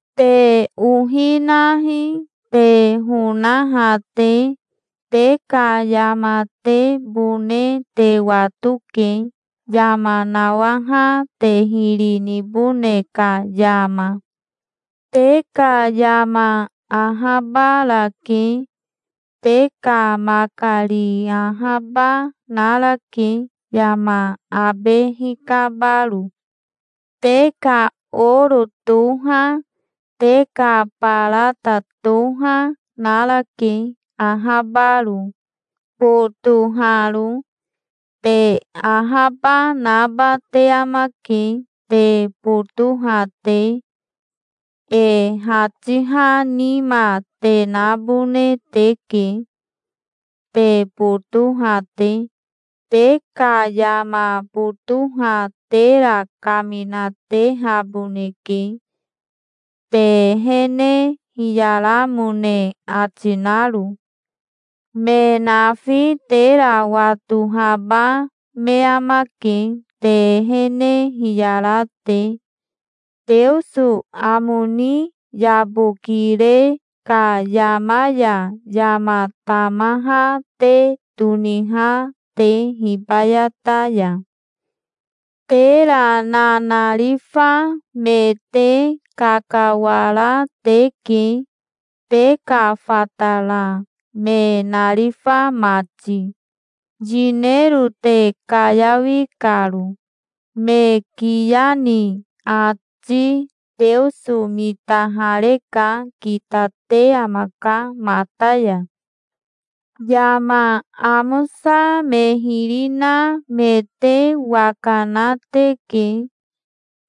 Te ohi nahi, te honaha te. Te ka yamatebone te watoke, yama nawaha te hiri nibone ka yama. Te ka yama ahabarake. Te ka makari ahaba narake, yama abe hikabaro. Te ka oro toha, te ka barata toha, narake, ahabaro, botoharo. Te ahaba naba te amake, te botoha te. E hatiha nima te nabone teke, te botoha te. Te ka yama botoha tera kaminatehaboneke, te ehene hiyaramone ati naro. Me nafi tera watohaba me amake, te ehene hiyara te, Teoso amo ni yabokire ka yama ya yama tamaha te toniha te hibayata ya. Tera nanarifa me te kakawara teke, te ka fatara me narifa mati, yinero te kayawi karo. Me kiya ni ati Teoso mitahareka. Kitate amaka mata ya. Yama amosa me hiri na me te waka na teke.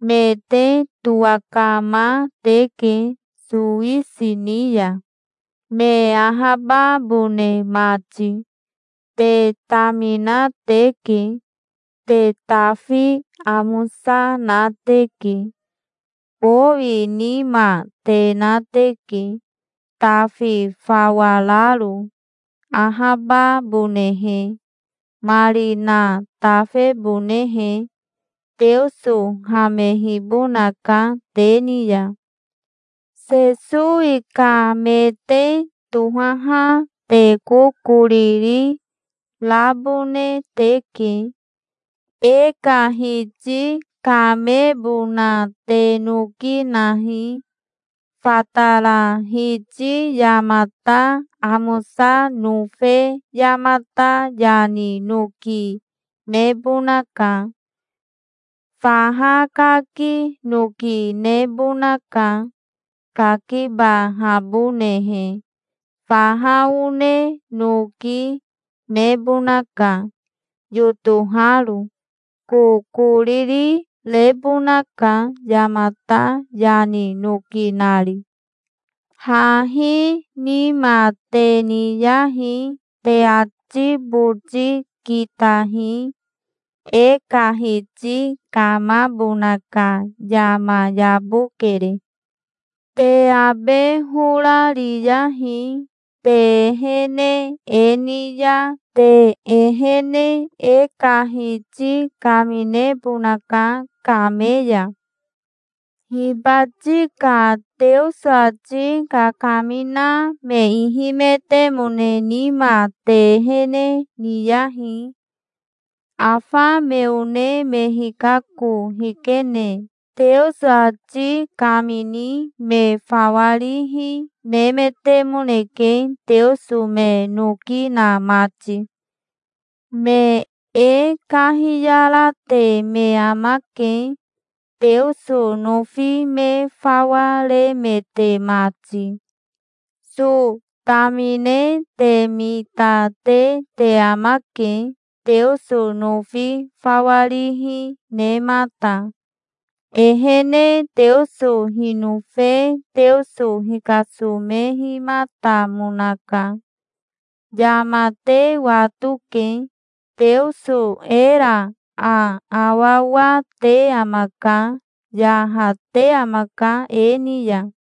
Me te towakama teke sowisi ni ya, me ahababone mati. Te tamina teke. Te tafi amosa na teke. Bowi nima te na teke, tafi fawa raro, ahababonehe, marina tafebonehe. Teoso hamehibonaka te ni ya. Sesowi ka me te tohaha te kokoriri rabone teke. E ka Hiti kamebona te noki nahi. Fatara hiti yamata amosa nofe yamata yani noki nebonaka. Faha kaki noki nebonaka, kakibahabonehe. Faha one noki, nebonaka, yotoharo. Kokoriri rebonaka, yamata yani noki nari. Hahi nima te niyahi. Te ati boti kitahi. E ka Hiti kamabona ka yama yabokere. Te abe hora riyahi. Te ehene e ni ya te ehene e ka Hiti kaminebonaka kame ya. Hibati ka Teoso ati kakamina me ihimetemone nima te ehene niyahi. Afa me one me hikako hikene Teoso ati kamini me fawa rihi nemetemoneke, Teoso me noki na mati. Me e kahiyarate me amake, Teoso nofi me fawa remete mati. So tamine te mita, te te amake, Teoso nofi fawa rihi nemata. Ehene Teoso hinofe Teoso hikasomehimatamonaka. Yama te watoke. Teoso era aawawa te amaka. Yahate amaka e ni ya.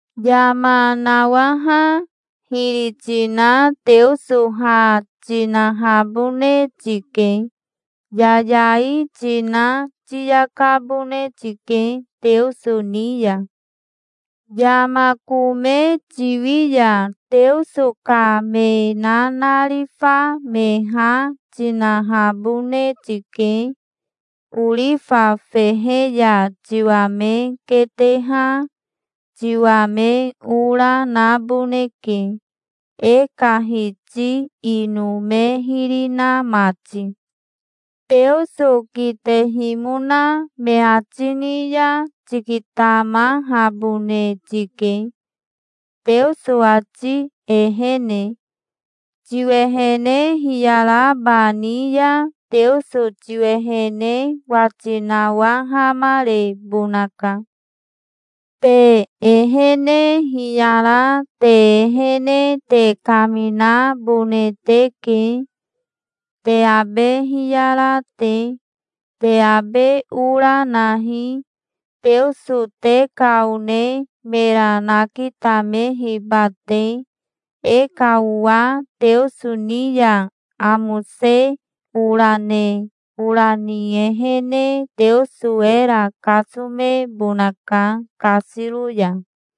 Yama nawaha hiri tina Teoso ha tinahabone tike. Yayai tina tiyakabone tike Teoso ni ya. Yama kome tiwi ya Teoso ka me nanarifa me ha tinahabone tike. Orifa fehe ya tiwa me keteha tiwa me ora naboneke, e ka Hiti ino me hiri na mati. Teoso kitehimona me ati ni ya tikitamahabone tike, Teoso ati ehene. Tiwehene hiyaraba ni ya Teoso tiwehene wati nawahamarebonaka. Te ehene hiyara te ehene te kaminabone teke, te abe hiyara te. Te abe ora nahi, Teoso te ka one mera nakitamehiba te. E ka owa Teoso ni ya amose ora ne, ora ni ehene Teoso era kasomebonaka kasiro ya.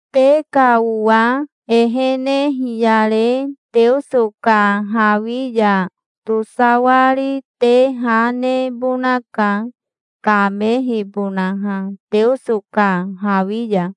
Te ka owa ehene hiyare Teoso ka hawi ya tosawari te ha nebonaka, kamehibonaha Teoso ka hawi ya.